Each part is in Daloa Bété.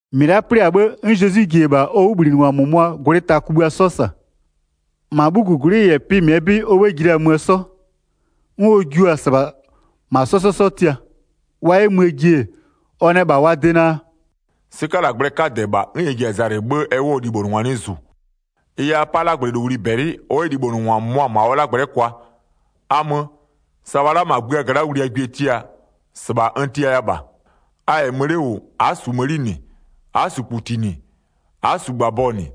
1-Mɩ la'a 'plɩ-a 'bhë, 'n Zezwi ji-e -bha ɔ 'wʋbhlinɩngwa -mʋmʋaa gwlɩ ta kugbïa 'sɔ -sa. -Ma 'bhugugwlɩ -yɛ pɩ -mɩɛ 'bɩ ɔ 'bhë ji la-a möö 'sɔ, 'n ɔ jua-a -sɩbha -ma 'sɔ 'sɔ 'sɔ tia. Wa 'yɛ möö ji-e, ɔ nɛ -bha wa de naa: “'Sɩkalagblɛɛ 'kadɛ -bha, 'n ɛ ji-a zalɩ 'bhë ɛ 'wʋɔ libhonʋngwa 'nɩ -zu. Ɩ yɛ a 'pa 'lagblɛlowli -bɛlɩ ɔ 'yɛ libhonʋngwa -mʋmʋa -ma ɔ 'lagblɛ'ɛ kwa. A mö, sa wa'a la'a -ma gbïa gla'a wliagwie tia, -sɩbha n tiaya -bha. A -yɛ mö 'le -wʋ, a'a -su mëni -nɩ, a'a -su -kputi -nɩ, a'a -su -gbabɔ -nɩ,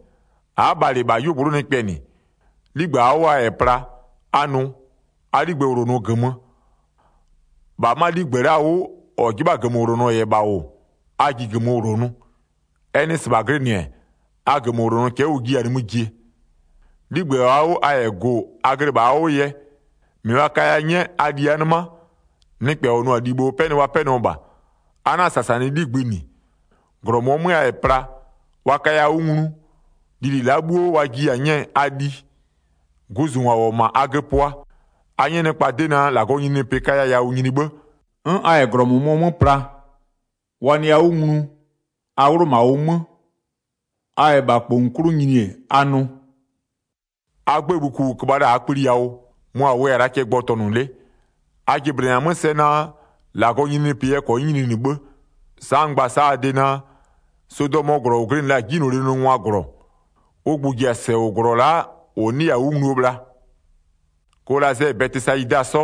a'a bhalɩ -bha 'yuogblʋ'ʋ nɩkpɛ -nɩ. 'Ligbë -aa 'wʋ a -yɛ pla, a nʋ: A 'ligbë -wlonʋ -gömö. 6-Bha 'ma 'ligbë la'a 'wʋ -ɔ 'jɩbha-a -gömöwlonɔ -yɛ -bha -wʋ a ji -gömö -wlonʋ. Ɛ nɩ -sɩbha glɩnɩ-ɛ, a -gömöwlonɔ cɛ'ɛ ʋ jiya-a nimï jie. 'Ligbë -aa 'wʋ a -yɛ gʋ-ʋ a glɩ -bha a 'wʋ yɛ, -mɩ wa kaya 'nyɛ, a li a nɩma, nɩkpɛ ɔ nʋ-a libho 'pɛnɩ wa 'pɛnɩɔ -bha. A 'na-a -sasanɩ 'ligbï -nɩ. 8-Glɔ -mʋɔ 'mö a -yɛ pla, wa kaya 'wʋ nglu, lili la'a bhuo wa jiya-a 'nyɛɛ, a liɩ. Guzungwa -wʋ-ɔ -ma a göpʋa, a 'nyɛ -maa nɩkpa 'dɩ naa: -Lagɔɔ nyininyinipɩ kaya yawʋ nyini 'bhë. 'N a -yɛ -glɔ -mʋmʋɔ 'mö pla, wa nɩya 'wʋ nglu, a 'wlʋ -ma ʋ 'mö. A -yɛ -bha -kpongu 'klʋ nyini-e, a nʋ: A 'gbëë bhuku -ʋ köbha la-a -bha -aa kpli yawʋ, mʋ -a wʋya-a la'a cɛ gbɔtɔnʋ 'le. A jɩblɩnɩ-a 'mö sɛ naa: -Lagɔɔ nyininyinipɩ yɛ -kɔnyɩ nyininɩ 'bhë. Sa'a n gba-a sa'a a de naa: Sodɔmöö -glɔ -ʋ glɩnɩ la-a 'jinylolie nʋngwaa -glɔ, -Lagɔɔ -zijlee zlɩ -yɛ nyini, ʋ gbʋ-ʋ ji-a -sɛ -wʋɔ -glɔ la'a -ʋ 'nɩya-a 'wʋ ngluo bhla. Kolazɛ -yɛ Bɛtɩsayida 'sɔ,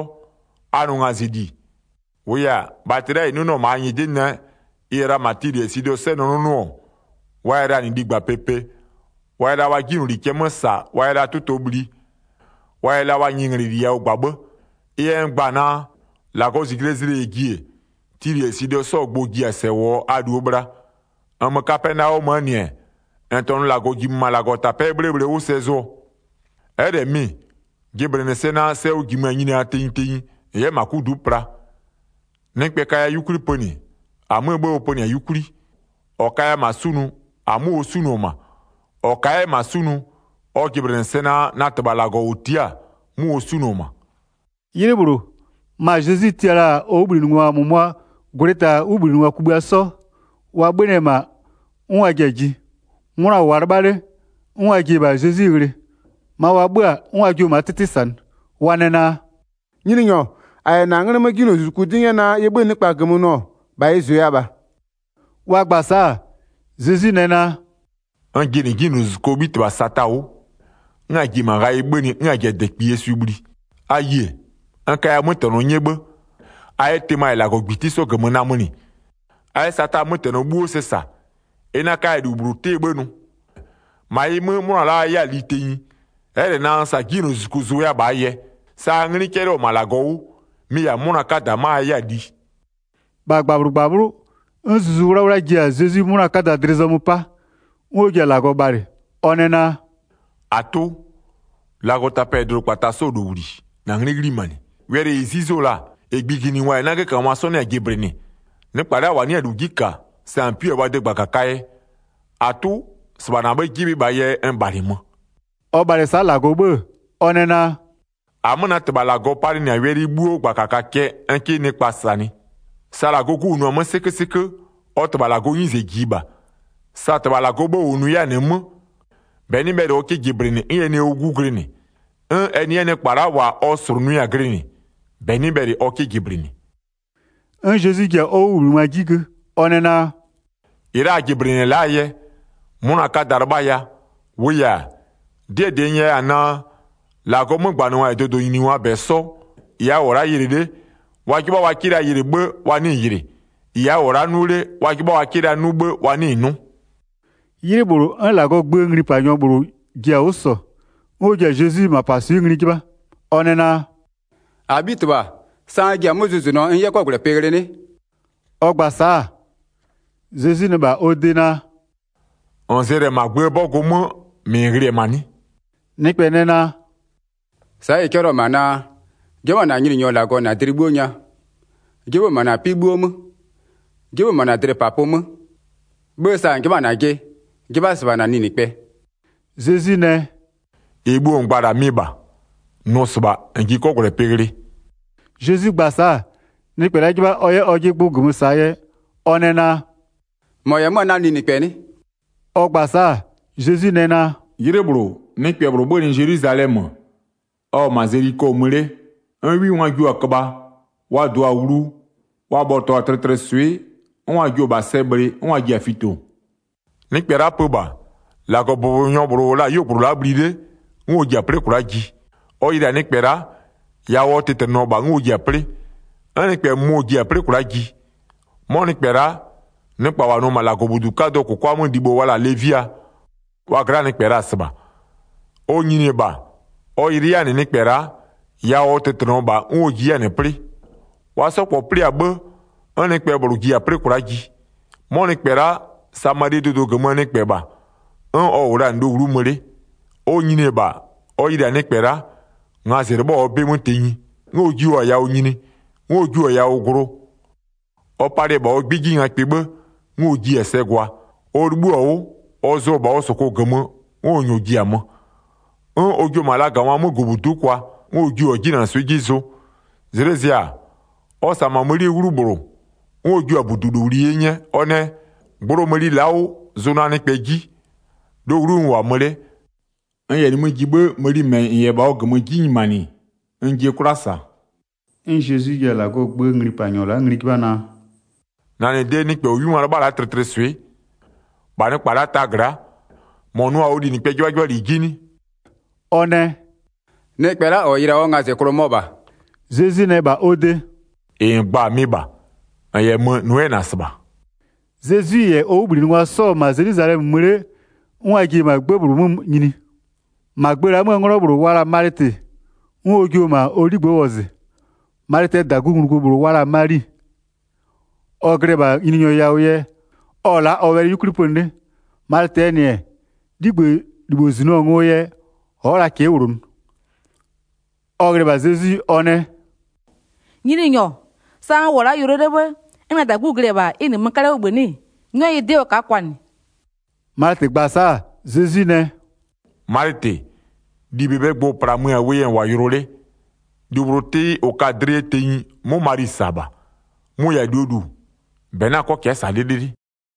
a nʋ ngazɩli. -Wʋʋ yɛ-a, bhatɩ la'a -ɩ 'nʋnʋɔ-ɔ -ma a nyɩdɩ nɛ ɩ -yɛ la -ma Tilɩ -yɛ Sidɔ 'sɔ nɛ 'nʋnʋɔ-ɔ wa yɛ la -nɩ ligba pepe, wa yɛ la wa 'jinyloli cɛ 'mö -sa, wa yɛ la 'tʋtɔ bhli, wa yɛ la wa nyɩnglɛli yawʋ -gba 'bhë. Ɩ yɛ n gba-a naa: -Lagɔɔ -zijlee zlɩ -yɛ ji-e, Tilɩ -yɛ Sidɔ 'sɔɔ gbʋ-ʋ ji-a -sɛ -wʋɔ a -luo bhla. 15-Nmö Kapɛnaɔmöö -nɩ-ɛ, -n -tɔnʋ -Lagɔ -jimö -ma -Lagɔtapɛ'ɛ 'bhlee bhle 'wʋ sɛ zʋɔ, ɛ'ɛ -lɛ mɩ-ɩ, jɩblɩnɩ sɛ naa: Sɛ ʋ -jimö-a nyiniaa tenyi tenyi -n 'yɛ -ma 'kudu'u pla. Nɩkpɛ kaya 'yukwli pönɩ, -amöö 'bhë ɔ pönɩ-a 'yukwli, -ɔ kaya -ma 'sunʋ -amö ɔ 'sunʋ-ɔ -ma, -ɔ ka'a 'yɛ -ma 'sunʋ, ɔ jɩblɩnɩ sɛ naa, na -Tɩbha -Lagɔ -ʋ tia'a-a, 'mʋ ɔ 'sunʋ-ɔ -ma.” 'Ylɩ -bhlʋ, ma Zezwi tia la-a ɔ 'wʋbhlinɩngwa -mʋmʋaa gwlɩ ta 'wʋbhlinɩngwa kugbïa 'sɔ, wa 'bhönɩ-ɛ -ma 'n wa ji-a ji. 'Mʋna -wʋʋa 'lɩbha 'le, 'n wa ji-e -bha Zezwi ghlɩ, ma wa 'bhö-a 'n wa jio-o -maa 'tɩtɩ -sanɩ. Wa nɛ naa: “Nyininyɔ, -a -yɛ -na 'nglɩ 'mö 'jinylozuzuku 'dɩ 'nyɛ naa ɩ 'bhö-ö nɩkpa -gömö nʋ-ɔ, -bha ɩ -zʋya -bha.” Wa gba-a sa'a, Zezwi nɛ naa: “N jɩnɩ 'jinylozuzukuo 'bhitɩbha Sata 'wʋ, 'n a ji-e -ma ghayɩ 'bhönɩ 'n a ji-a -dɛkpiyie swɩ bhli. A yie, n kaya 'mötɛnɔ 'nyɛ 'bhë, a 'yɛ tɩma -yɛ -lagɔgbiti 'sɔ -gömö namönɩ, a 'yɛ Sataa 'mötɛnɔ 'bhuo sɛ -sa, ɩ 'na 'kaya -lu -bhlʋ 'tɩɛ 'bhë nʋ. 20-Ma ɩ 'mö, 'mʋna la'a -a a 'yɛ-a li tenyi, ɛ'ɛ -lɛ naa sa 'jinylozuzuku zʋya-a -bhaa yɛ, sa a 'nglɩ 'cɛlɩɔ-ɔ -ma -Lagɔ 'wʋ, mɩ-ɩ -yɛ-a 'mʋna 'kada 'ma a 'yɛ-a li.” -Wa -Lagɔ -slʋnʋ-a ʋ 'Gu 21-Bha -gbabhlʋ -gbabhlʋ'ʋ, 'n Zuzu 'Wlawla ji-a Zezwi 'mʋna 'kada dlɩ zɔmö 'pa, 'n ɔ ji-a -Lagɔ bhalɩ, ɔ nɛ naa: “-Atʋ, -Lagɔtapɛ -yɛ dʋdʋkpata 'sɔɔ -lowli, -na 'nglɩ 'ghlimanɩ. Wɛlɩ -ɩ 'zuzo-o la-a, -ɩ gbʋjingwa -yɛ 'nagökangwa 'sɔ 'nɩ-a jɩblɩnɩ, nɩkpa la'a -wa 'nɩ-a -lu 'ji -ka, sa -n 'pui-a wa de -gbakakaa yɛ. -Atʋ, -sɩbha -na 'bhë 'jɩbhɩ la -bhaa yɛ n -bhalɩmö.” Ɔ bhalɩ-ɛ sa'a -Lagɔ 'bhë-ë, ɔ nɛ naa: “-Amö na -Tɩbha -Lagɔ palɩnɩ-a wɛlɩ 'bhuo -gbakaka cɛ n 'kɩ nɩkpa -sanɩ. Sa -Lagɔɔ 'Gu -wʋnʋ-a 'mö 'sɩkösɩkö, ɔ -Tɩbha -Lagɔɔ 'nyize -jiɩ -bha. Sa -Tɩbha -Lagɔɔ 'bhë -wʋnʋ 'yɛ-a -nɩ 'mö, -bɛ 'nɩ bhɛlɩ ɔ 'kɩ -jɩblɩnɩ 'n ɛ nɩ ʋ 'Gu glɩnɩ, 'n ɛ nɩ 'yɛ nɩkpa -wa ɔ -slʋnʋɩ-a glɩnɩ, -bɛ 'nɩ bhɛlɩ ɔ 'kɩ jɩblɩnɩ.” 'N Zezwi ji-a ɔ 'wʋbhlinɩngwa 'ji gö, ɔ nɛ naa: “-Ɩ la'a a jɩblɩnɩ-ɛ la'aa yɛ, 'mʋna 'kada 'lɩbhaya. 24-Wʋʋ yɛ-a, 'dɩɛ -dɩ n nyɛya-a naa: -Lagɔɔ 'mögbanɩngwa -yɛ dʋdʋnyiningwaa -bɛ 'sɔ, -ɩ a -wʋ-ɔ la'a yɩlɩ 'le, wa 'jɩbha la wa 'kɩ yɩlɩ 'bhë, wa 'nɩɩ-ɩ yɩlɩ. -Ɩ a -wʋ-ɔ la'a 'nʋ 'le, wa 'jɩbha la 'yɛ wa 'kɩ 'nʋ 'bhë, wa 'nɩɩ-ɩ 'nʋ.” 'Ylɩ -bhlʋ, 'n -Lagɔɔ gböö nglipanyɔ -bhlʋ ji-a 'wʋ -sɔ, 'n ɔ ji-a Zezwi -mapaswɩ'ɩ ngli 'jɩbha, ɔ nɛ naa: “-Abhitɩbha, sa n ji-a 'mö zʋzʋnʋɔ n 'yɛ 'kɔgwlɛpɩ ghlɩ 'nɩ?” Ɔ gba-a sa'a, Zezwi nɛ -bha ɔ de naa: “-N zɛlɩ-ɛ -ma -aa gböö 'bɔgʋ 'mö, -mɩ -n ghlɩ-ɛ -ma 'nɩ?” Nɩkpɛ nɛ naa: “Sa'a ɩ 'cɛlɩɔ-ɔ -ma naa: 'Jɩbha -na Nyininyɔ -Lagɔ -na dlɩ 'bhuo nya, 'jɩbhʋ -ma -na 'pɩ 'bhuo 'mö, 'jɩbhʋ -ma -na dlɩpapʋ 'mö. 'Bhë sa -n 'jɩbha-a -najɩ 'jɩbha 'yɛ -sɩbha -na linɩkpɛ.” Zezwi nɛ: “-Ɩ bhuo -n gba-a -la mɩ -bha. Nʋ -sɩbha, -n ji 'kɔgwlɛpɩ ghlɩ.” Zezwi gba-a sa'a, nɩkpɛ la'a 'jɩbha ɔ 'yɛ ɔjɩ gbʋ -gömö -saa yɛ ɔ nɛ naa: “-Mɔ -yɛ 'mö-a na linɩkpɛ 'nɩ?” Ɔ gba-a sa'a, Zezwi nɛ naa: “'Ylɩ -bhlʋ, nɩkpɛ -bhlʋ 'bhönɩ Zelwizalɛmö, ɔ-ɔ -ma Zeliko mö 'le, 'n 'wingwa jio-a köbha, wa -dɩɔ-a wlu, wa bhɔtɔɔ-a tlɩtlɩswɩ'ɩ, 'n wa jio-o -bha sɛ bhlɩ, 'n wa ji-a fito. Nɩkpɛ la'a pö -bha, -Lagɔbʋbɔnyɔ -bhlʋ -wʋ la-a 'yuogblʋ la'a bhli 'le, 'n ɔ ji-a 'plɩ kwla'a ji. Ɔ yɩlɩ-a nɩkpɛ la'a, yawʋ ɔ tɩtlɩnɩɔ -bha 'n ɔ ji-a 'plɩ. 'N nɩkpɛ -mʋmɔ ji-a 'plɩ kwla'a ji. 'Mɔ nɩkpɛ la'a, nɩkpa -wa nʋ-ɔ -ma -Lagɔbudu 'kadʋɔ -kʋkwa 'mö libho wa la-a Levia, wa gla'aa nɩkpɛ la-a -sɩbha. Ɔ nyini-e -bha, ɔ yɩlɩ 'yɛ-a -nɩ nɩkpɛ la'a, yawʋ ɔ tɩtlɩnɩɔ -bha 'n ɔ ji 'yɛ-a -nɩ 'plɩ. Wa 'sɔ -kpɔ 'plɩ-a 'bhë, 'n nɩkpɛ -bhlʋ ji-a 'plɩ kwla'a ji. 'Mɔ nɩkpɛ la'a, Samalie dʋdʋ -gömöö nɩkpɛ -bha, 'n ɔ -wʋ la-a -nɩ lowlu'u mö 'le. Ɔ nyini-e -bha, ɔ yɩlɩ-a nɩkpɛ la'a, ngazɩ 'lɩbhɔ-a ɔ 'bɩ 'mö tenyi. 'N ɔ jio-a yawʋ nyini, 'n ɔ jio-a yawʋ glʋ. Ɔ palɩ-ɛ -bha ɔ 'gbɩ 'ji ngakpɩ 'bhë, 'n ɔ jiɩ-a sɛ gwa. Ɔ 'libhïɔ-a 'wʋ, ɔ zʋɔ-ɔ -bha ɔ -sʋkʋ -gömö, 'n ɔ -nyɔɔ ji-a mö. 'N ɔ jio-o -ma lagangwaa 'mögʋbudu'u kwa, 'n ɔ jio-a 'jinanɩswɩ'ɩ 'ji zʋ. Zlɩ zɩ-a, ɔ -sa-a -ma mënie 'wlu -bhlʋ, 'n ɔ jiʋ-a -budulowli 'ye 'nyɛ, ɔ nɛ: Gblo mëni la'a 'wʋ, zʋ na nɩkpɛ 'ji, lowlu'u n -wʋ-a mö 'le. N -yɛ nimï ji 'bhë, mëni -mɛ -n -yɛ -bha ɔ -gömö 'ji nyimanɩ, n jie 'kwla -sa.” 'N Zezwi ji-a -Lagɔɔ gböö nglipanyɔ la'a ngli 'jɩbha naa: “-Na -nɩ de nɩkpɛ -ɔ 'wingwa 'lɩbha-a la'a tlɩtlɩswɩ'ɩ, -bha nɩkpa la'a taa gla'a, -mɔ nʋɔ-a ɔ linɩkpɛɛ 'jɩbhajɩbhali 'ji 'nɩ?” Ɔ nɛ: “Nɩkpɛ la'a -ɔ yɩlɩ-a ɔ ngazɩklʋ mɔ -bha.” Zezwi nɛ -bha ɔ de: “-Ɩ -n gba-a, mɩ -bha. -N -yɛ mö-ö, nʋ 'yɛ -na -sɩbha.” Zezwi -yɛ ɔ 'wʋbhlinɩngwa 'sɔ-ɔ -ma Zelwizalɛmö mö 'le 'n wa ji-e -ma 'gbë -bhlʋ 'mö nyini. -Ma gbë la'a 'möö 'nglɔ -bhlʋ wa la-a Malɩtɩ, 'n ɔ jio-o -ma ɔ 'ligbë'ë wɔzɩ. Malɩtɩɛ -dagunglugu -bhlʋ wa la-a Mali, ɔ glɩ-ɛ -bha Nyininyɔ yawʋ yɛ, ɔ-ɔ la'a ɔ wɛlɩ 'yukwli pönɩ 'le. Malɩtɩɛ -nɩ-ɛ, 'ligbëlibho -zinɩɔ-a ngoo yɛ, ɔ'ɔ la cɛ'ɛ -wlonʋ. Ɔ ghlɩ-ɛ -bha Zezwi, ɔ nɛ: “Nyininyɔ, sa n -wʋ-ɔ la'a yʋlɔ 'le 'bhë 'n na -dagu glɩ-ɛ -bha, ɩ -nɩmö 'kalɛ 'wʋ -bhï 'nɩ-ɩ? 'Nyɔ yɩ 'dɩ ɔ ka'a kwanɩ.” Malɩtɩ gba-a sa'a, Zezwi nɛ: “Malɩtɩ, -li -bebee gbʋ-ʋ -plamö-a wʋ yɛ -n -wʋ-a yʋlɔ 'le. 42-Lu -bhlʋ 'tɩɩ -ʋ ka-a dlɩ yɛ tenyi 'mʋ Mali -sa la'a -bha. Mʋ-ʋ -yɛ-a -luo -lu, -bɛ 'na 'kɔ cɛ'ɛ -sa 'lɩlɩlɩ.”